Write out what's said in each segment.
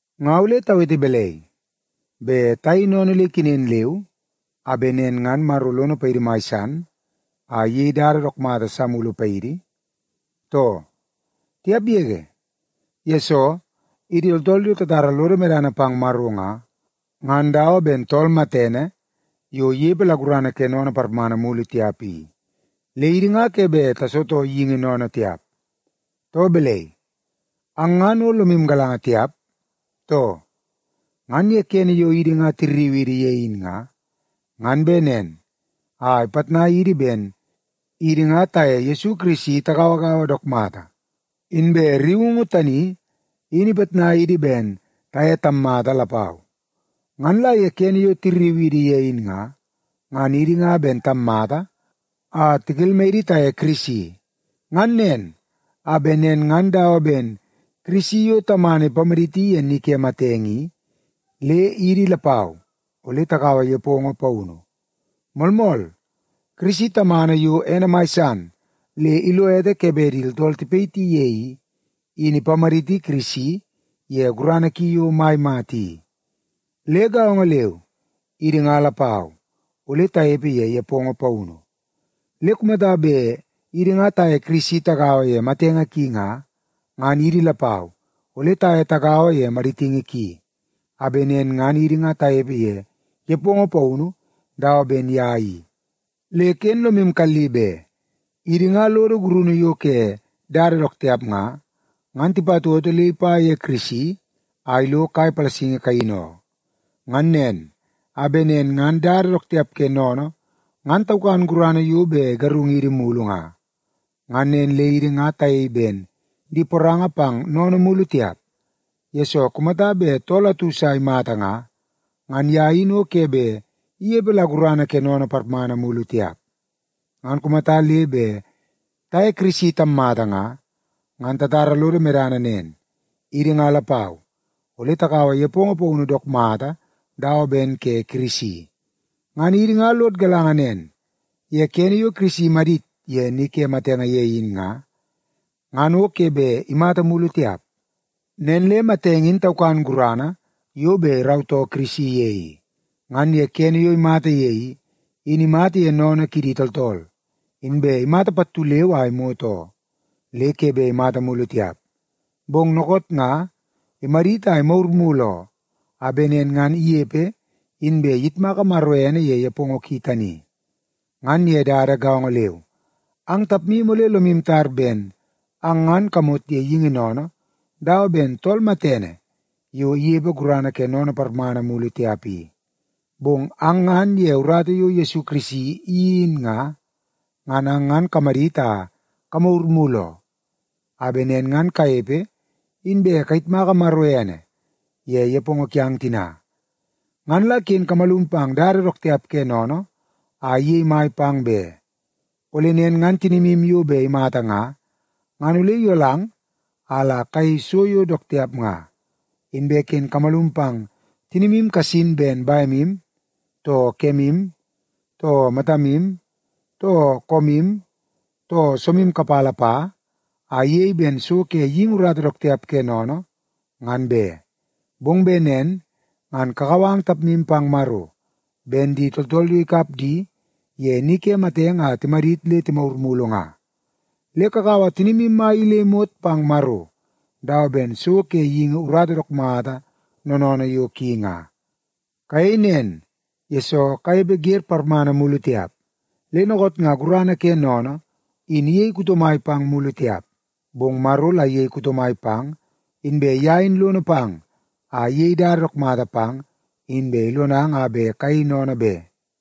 Nga ole tawete balai? Bet tayei sennene le ikenen leu a bet nen ngan Maro lono paidi mai san a iyei dada dook mata sa mulu paidi, too? Tiap yege! Yesoo, idi tooltool yo tatara lodo medana pang Maro nga, ngan dawa ben tool matene yo inepe la gurana ke sennene parmana mulu tiap i, le idi nga ke bet tasitoo geingi sennene tiap. Too balai, ang ngan o lomu galanga tiap, too? Ngan ye kene yo idi nga tirriu idi ye in nga, ngan bet nen a ipitnai idi ben idi nga taye Yesu Kirisi tagauagaua dook mata, inbe rriungu tani in ipitnai idi ben taye tammata lapau. Ngan la ye kene yo tirriu idi ye in nga, ngan idi nga ben tammata a tikelmai idi taye Kirisi. Ngan nen, a bet nen ngan dawa ben Kirisi yo Tamana ipamaditi ye ni ke matenge i, le idi lapau ole takaua nepongo paunu. Moolmool, Kirisi Tamana yo ene mai san le ilo ete ke bet tooltool tipayiti ye i, in ipamaditi Kirisi ye gurana ki yo mai mata i. Le gaongo leu, idi nga lapau ole tanepe ye nepongo paunu. Le kumata bet idi nga taye Kirisi tagaua ye matenge ki nga, ngan idi lapau ole taye tagaua ye maditingi ki, a bet nen ngan idi nga tanepe ye nepongo paunu dawa ben ye i. Le ken lomu kalli be, idi nga lodo gurunu yo ke dada dook tiap nga, ngan tipatoto le ipa ye Kirisi a ilo kai palasingi kaini oo. Ngan nen, a bet nen ngan dada dook tiap ke sennene ngan taukan gurana yo bet igarungidi mulu nga. Ngan nen le idi nga tayei ben di poranga pang sennene mulu tiap, yesoo kumata bet tool atu sa imata nga, ngan ye in o ke bet inepe la gurana ke sennene parmana mulu tiap. Ngan kumata le bet taye Kirisi tammata nga, ngan tatara lodo medana nen; idi nga lapau ole takaua nepongo paunu dook mata dawa ben ke Kirisi. Ngan idi nga lod galanga nen, ye kene yo Kirisi imadit ye ni ke matenge ye in nga, ngan o ke bet imata mulu tiap. Nen le matenge in taukan gurana yo bet irautoo Kirisi ye i. Ngan ye kene yo imata ye i, in imata ye sennene kidi tooltool, inbe imata pattu leu a imot oo, le ke bet imata mulu tiap. Bong dookoot nga imadit a imagur mulu oo, a bet nen ngan inepe inbe iyitmaka Maro ene ye nepongo ki tani. Ngan ye dada gaongo leu, ang tapmu ole lomu tar ben ang ngan kamot ye geingi sennene dawa ben tool matene yo inepe gurana ke sennene parmana mulu tiap i. Bong ang ngan ye urata yo Yesu Kirisi iyeii in nga, ngan ang ngan kamadit a kamagur mulu oo, a bet nen ngan kanepe inbe kayitmaka Maro ene ye nepongo kiang tina. Ngan la ken kamalum pang dada dook tiap ke sennene a iyei mai pang be. Ole nen ngan tinimu yo bet imata nga, ngan ole iyolang a la kayei so yo dook tiap nga. Inbe ken kamalum pang tinimu kasin ben bemu, too kemu, too matamu, too koomu, too soomu kapala pa, a iyei ben so ke geingi urata dook tiap ke sennene, ngan be. Bong bet nen ngan kakau ang tapmu pang Maro, ben di tooltool yo ikap di ye ni ke matenge a timadit le timagur mulu nga. Le kakaua tinimu mai i le imot pang Maro dawa ben so ke geingi urata dook mata noonoonoo yo ki nga. Kayei nen, yesoo kanepe wer parmana mulu tiap. Le dookoot nga gurana ke sennene in iyei kuto mai pang mulu tiap, bong Maro la iyei kuto mai pang, inbe ye in lono pang a iyei dada dook mata pang inbe ilonang a bet kayei sennene be.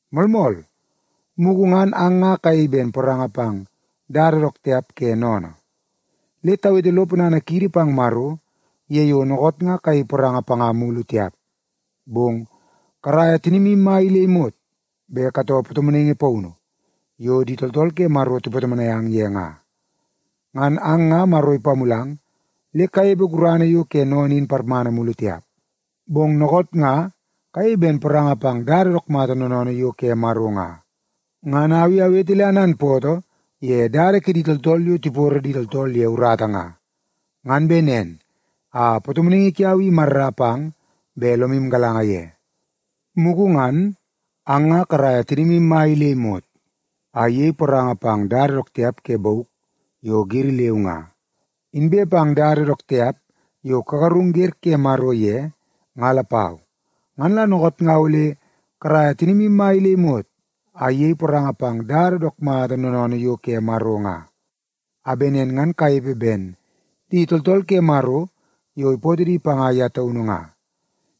Moolmool, mugu ngan ang nga kayei ben poranga pang dada dook tiap ke sennene. Le tawete lo ponana kiidi pang Maro ye yo dookoot nga kayei poranga panga mulu tiap, bong karaia tinimu mai i le imot bet katoo patomonaingi paunu yo di tooltool ke Maro tipatomonai ang ye nga. Ngan ang nga Maro ipamulang le kanepe gurana yo ke sennene in parmana mulu tiap, bong dookoot nga kayei ben poranga pang dada dook mata noonoonoo yo ke Maro nga. Ngan au i awete le ananpootoo ye dada kidi tooltool yo tiporo di tooltool ye urata nga, ngan bet nen a patomonaingi kiau i imarra pang bet lomu galanga ye. Mugu ngan ang nga karaia tinimu mai i le imot a iyei poranga pang dada dook tiap ke bauk yo giri leu nga, inbe pang dada dook tiap yo kagarung wer ke Maro ye nga lapau. Ngan la dookoot nga ole karaia tinimu mai i le imot a iyei poranga pang dada dook mata noonoonoo yo ke Maro nga, a bet nen ngan kanepe ben di tooltool ke Maro yo ipootoo di panga ye taunu nga.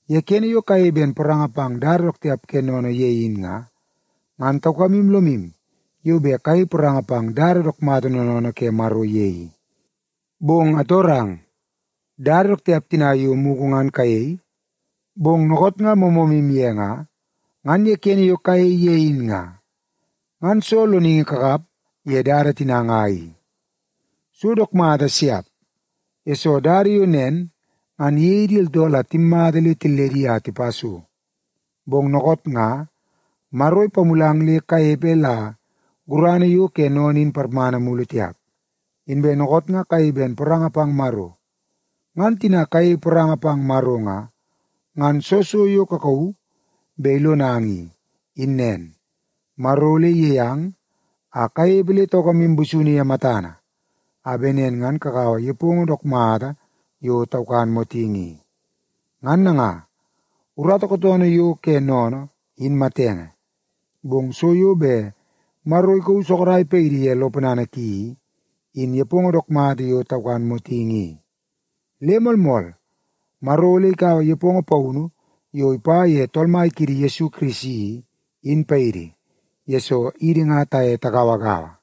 Ye kene yo kayei ben poranga pang dada dook tiap ke sennene ye in nga, ngan taukamu lomu yo bet kayei poranga pang dada dook mata noonoonoo ke Maro ye i. Bong atorang, dada dook tiap tina yo mugu ngan kayei, bong dookoot nga moomoomu ye nga, ngan ye kene yo kayei ye in nga, ngan soo loningi kakap ye dada tina nga i? So dook mata siap, yesoo dada yo nen ngan iyei di tooltool a timmata le tilledi a tipa so. Bong dookoot nga Maro ipamulang le kanepe la gurana yo ke sennene in parmana mulu tiap, inbe dookoot nga kayei ben poranga pang Maro. Ngan tina kayei poranga pang Maro nga, ngan soo so yo kakauu bet ilonang i, in nen: Maro ole iyei ang a kanepe le taukamu busunu ye matana, a bet nen ngan kakaua nepongo dook mata yo taukan motingi i. Ngan nanga, urata kootoonoo yo ke sennene, in matenge, bong so yo bet Maro ikauu sorok paidi ye lo ponana ki i, in nepongo dook mata yo taukan motingi i. Le moolmool, Maro ole ikaua nepongo paunu yo ipa ye Tool Mai kiidi Yesu Kirisi i, in paidi, yesoo idi nga taye tagauagaua.